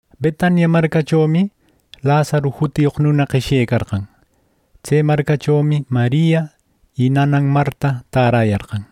Betania marcachomi Lazaru jutiyoq nuna qeshyecarqan. Tse marcachomi Maria y nanan Marta täräyarqan.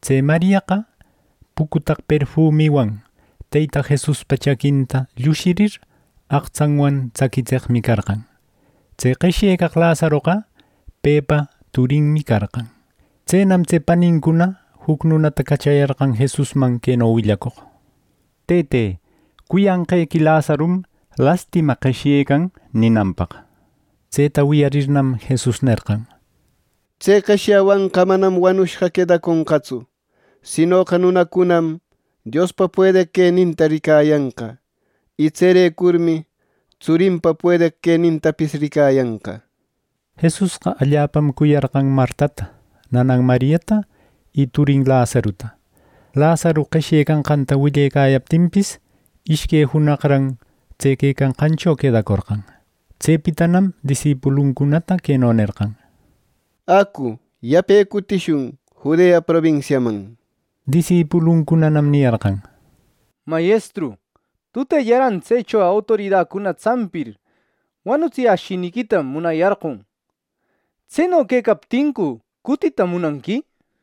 Tse Mariaqa pucutaq perfumiwan Teyta Jesuspa chaquinta llushir aqtsanwan tsaquitseqmi carqan. Tse qeshyecaq Lazaroqa pepa turinmi carqan. Tsenam tse panincuna juc nunata cachayarqan Jesusman, queno willacoq: —Tëte, cuyanqequi Lazarum lastima qeshyecan —ninanpaq. Tseta wiyarninnam, Jesus nerqan: —Tse qeshyawanqa manam wanushqa quedaconqantsu, sinoqa nunacunam Diospa puedeq queninta ricayanqa, y tserecurmi tsurinpa puedeq quenintapis ricayanqa —nir. Jesusqa allapam cuyarqan Martata, nanan Mariata y turin Lazaruta Lazaru qeshyecanqanta willecayaptinpis, ishque junaqran tse quecanqancho quedacorqan. Tsepitanam disipuluncunata queno nerqan: —Acu, yape cutishun Judea probinsiaman —nir. Disipuluncunanam niyarqan: —Mayestru, ¡tutellaran tsecho autoridacuna tsampir, wanutsiyäshiniquita munayarqon! ¿Tseno quecaptincu cutita munanqui! —nir.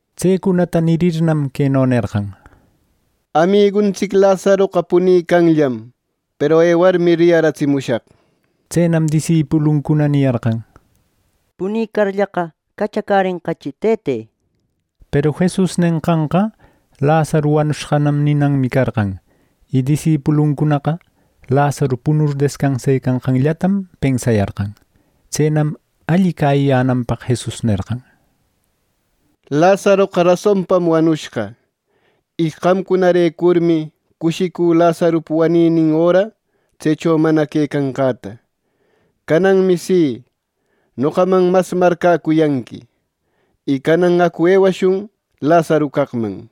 Tsecunata nirirnam, queno nerqan: —Amiguntsic Lazaroqa punicanllam, peru ewarmi riyaratsimushaq —nir. Tsenam disipuluncuna niyarqan: —Punicarllaqa, cachacärenqachi, Tëte —nir. Peru Jesus nenqanqa Lazaru wanushqanam ninanmi carqan; y disipuluncunaqa Lazaru punur descansecanqanllatam pensayarqan. Tsenam alli cäyiyänanpaq Jesus nerqan: —Lazaroqa rasonpam wanushqa. Y qamcunarecurmi cushicü Lazarupa waninin öra tsecho mana quecanqäta. Cananmi si, noqaman mas marcäcuyanqui. Y canan acu ewashun Lazaru caqman —nir.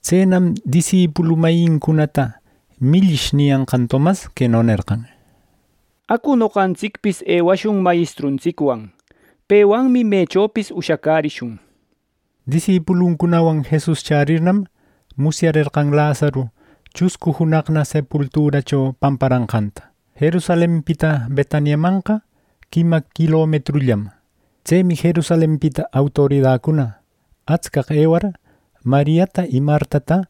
Tsenam disipulu mayincunata “Millish” niyanqan Tomas queno nerqan: —Acu noqantsicpis ewashun mayestruntsicwan; pewanmi mechopis ushacärishun —nir. Disipulucunawan Jesus chärirnam, musyarerqan Lazaru chuscu junaqna sepulturacho pamparanqanta. Jerusalenpita Betaniamanqa quima quilometrunollam. Tsemi Jerusalenpita autoridacuna atscaq ewar, Mariata y Martata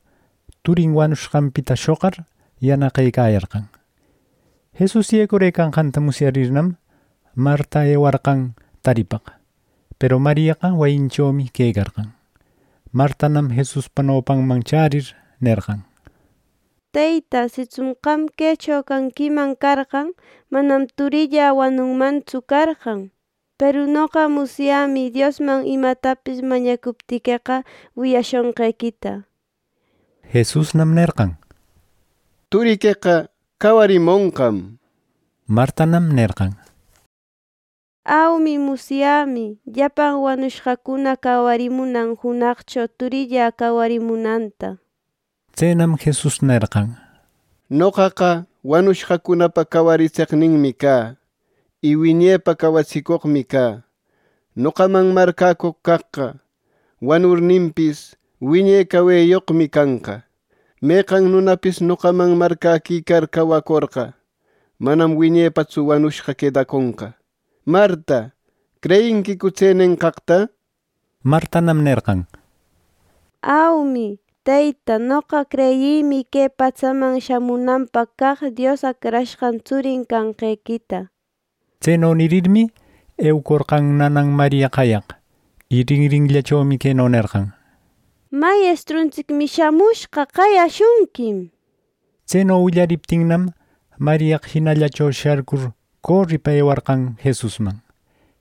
turin wanushqanpita shoqar yanaqëcayarqan. Jesus yecurëcanqanta musyarirnam, Marta ewarqan taripaq, peru Mariaqa wayinchomi quecarqan. Martanam Jesuspa nopanman chärir nerqan: —Teyta, sitsun qam quecho quecanquiman carqan, manam turillä wanunmantsu carqan. Peru noqa musyämi Diosman imatapis mañacuptiqueqa wiyashonqequita —nir. Jesusnam nerqan: —Turiqueqa cawarimonqam —nir. Martanam nerqan: —Aumi, musyämi. Llapan wanushqacuna cawarimunan junaqcho turillä cawarimunanta —nir. Tsenam Jesus nerqan: —Noqaqa wanushqacunapa cawaritseqninmi cä, y wiñepa cawatsicoqmi cä. Noqaman marcäcoq caqqa wanurninpis, wiñe caweyoqmi canqa. Meqan nunapis noqaman marcäquicar cawacorqa, manam wiñepatsu wanushqa quedaconqa. Marta, ¿creyinquicu tse nenqaqta? —nir. Martanam nerqan: —Aumi, Teyta, noqa creyïmi que patsaman shamunanpaq caq Dios Acrashqan tsurin canqequita —nir. Tseno nirirmi, eucorqan nanam Maria qayaq, y rinrinllachomi queno nerqan: —Mayestruntsicmi chämushqa. Qayashunquim —nir. Tseno willariptinnam, Mariaqa jinallacho sharcur coripa ewarqan Jesusman.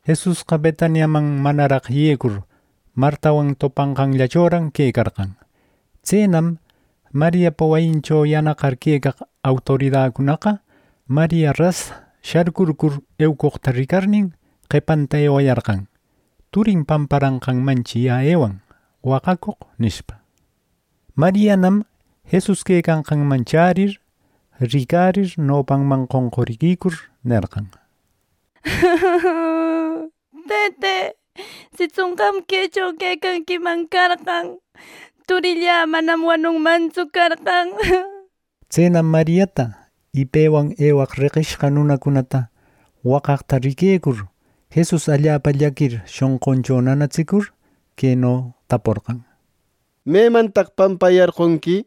Jesusqa Betaniaman manaraq yecur, Martawan topanqanllachoran quecarqan. Tsenam Mariapa wayincho yanaqar quecaq autoridacunaqa, Maria ras sharcurcur eucoqta ricarnin qepanta ewayarqan “Turin pamparanqanmanchi yä ewan waqacoq” nishpa. Marianam Jesus quecanqanman chärir, ricarir, nopanman qonquriquicur nerqan: —Tëte, sitsun qam quecho quecanquiman carqan, turillä manam wanunmantsu carqan —nir. Tsenam Mariata y pewan ewaq reqishqa nunacunata waqaqta riquecur, Jesus allapa llaquir shonquncho nanatsicur, queno taporqan: —¿Memantaq pampayarqonqui? —nir.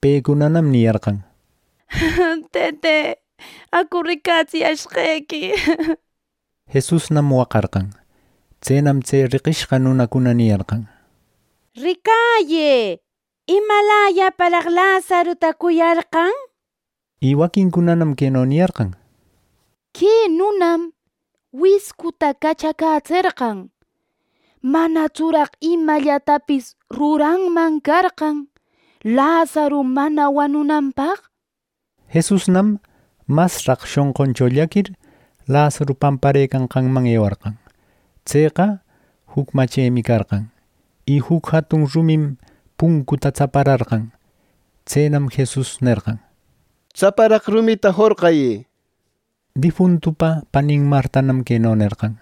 Pecunanam niyarqan: —Tëte, acu ricatsiyashqequi —nir. Jesusnam waqarqan. Tsenam tse reqishqa nunacuna niyarqan: —¡Ricayë, imalayaparaq Lazaruta cuyarqan! —nir. Y waquincunanam queno niyarqan: —Que nunam wiscuta cachacätserqan. ¿Manatsuraq imallatapis ruranman carqan Lazaru mana wanunanpaq? —nir. Jesusnam masraq shonquncho llaquir Lazaru pamparëcanqanman ewarqan. Tseqa juc machemi carqan. Y juc jatun rumim puncunta tsapararqan. Tsenam Jesus nerqan: —Tsaparaq rumita jorqayë —nir. Difuntupa panin Martanam queno nerqan: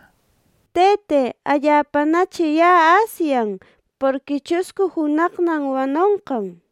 —Tëte, allapanachi yä asyan, porqui chuscu junaqnam wanonqan —nir.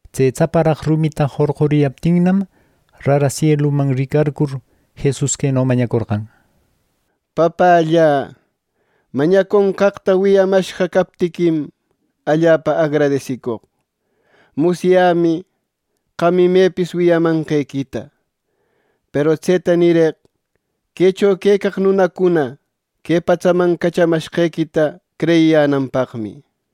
Tse tsaparaq rumita jorquriyaptinnam, rara sieluman ricarcur Jesus queno mañacorqan: —Papällä, mañaconqaqta wiyamashqa captiquim allapa agradesicoq. Musyämi qam imepis wiyamanqequita; peru tseta nireq quecho quecaq nunacuna que patsaman cachamashqequita creyiyänanpaqmi —nir.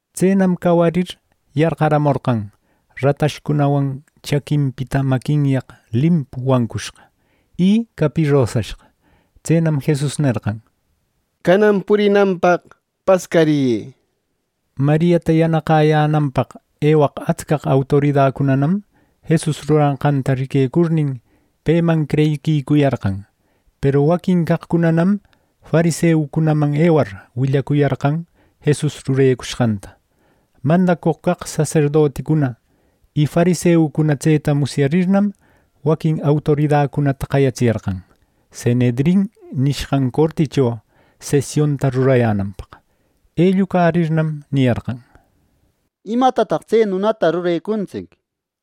Tsenam cawarir yarqamorqan ratashcunawan chaquinpita maquinyaq limpu wancushqa y capirosashqa. Tsenam Jesus nerqan: —Canan purinanpaq pascariyë —nir. Mariata yanaqäyänanpaq ewaq atscaq autoridacunam Jesus ruranqanta riquecurnin, peman creyiquicuyarqan. Peru waquin caqcunanam fariseucunaman ewar, willacuyarqan Jesus rurecushqanta. Mandacoq caq saserdoticuna y fariseucuna tseta musyarirnam, waquin autoridacunata qayatsiyarqan Sanhedrin nishqan corticho sesionta rurayänanpaq. Ellucarirnam niyarqan: —¿Imatataq tse nunata rurecuntsic!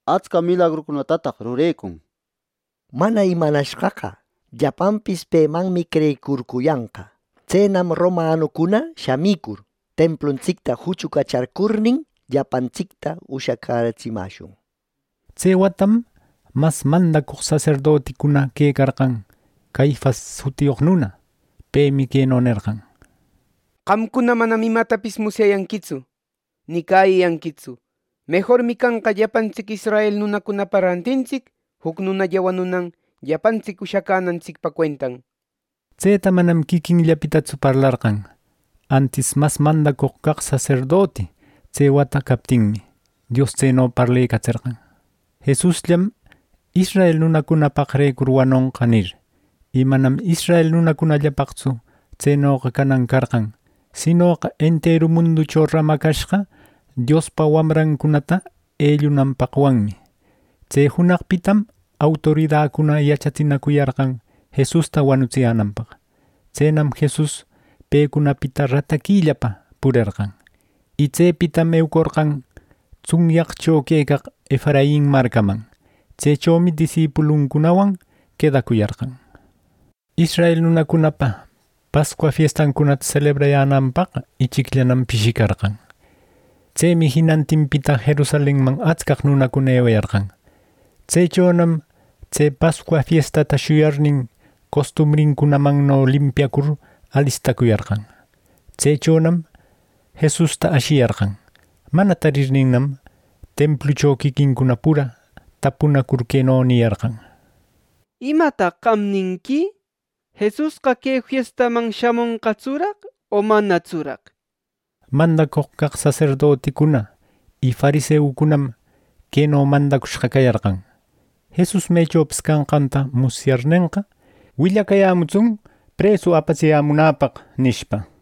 ¡Atsca milagrucunatataq rurecun! Mana imanashqaqa, llapanpis pemanmi creyicurcuyanqa. Tsenam Romanucuna shamicur templuntsicta juchucacharcurnin, llapantsicta ushacätsimäshun —nir. Tse watam mas mandacoq saserdoticuna quecarqan Caifas jutiyoq nuna. Pemi queno nerqan: —¡Qamcuna manam imatapis musyayanquitsu ni cäyiyanquitsu! Mejormi canqa llapantsic israel nunacunapa rantintsic juc nunalla wanunan llapantsic ushacänantsic cuenta —nir. Tseta manam quiquinllapitatsu parlarqan, antis, mas mandacoq caq saserdoti tse wata captinmi, Dios tseno parlecatserqan “Jesusllam israel nunacunapaqrecur wanonqa” nir. Y manam israel nunacunallapaqtsu tsenoqa canan carqan, sinoqa enteru munducho ramacashqa Diospa wamrancunata ellunanpaqwanmi. Tse junaqpitam autoridacuna yachatsinacuyarqan Jesusta wanutsiyänanpaq. Tsenam Jesus pecunapita rataquillapa purerqan. Y tsepitam eucorqan tsunyaqcho quecaq Efrain marcaman. Tsechomi disipuluncunawan quedacuyarqan. Israel nunacunapa Pascua fiestancunata selebrayänanpaq ichicllanam pishicarqan. Tsemi jinantinpita Jerusalenman atscaq nunacuna ewayarqan. Tsechonam tse Pascua fiestata shuyarnin, costumbrincunamanno limpiacur alistacuyarqan. Tsechonam Jesusta ashiyarqan. Mana tarirninnam, templucho quiquincuna pura tapunacur queno niyarqan: —¿Imataq qam ninqui? ¿Jesusqa que fiestaman shamonqatsuraq o manatsuraq? —nishpa. Mandacoq caq saserdoticuna y fariseucunam queno mandacushqa cayarqan: —Jesus mechopis canqanta musyarnenqa, willacayämutsun presu apatsiyämunäpaq —nishpa.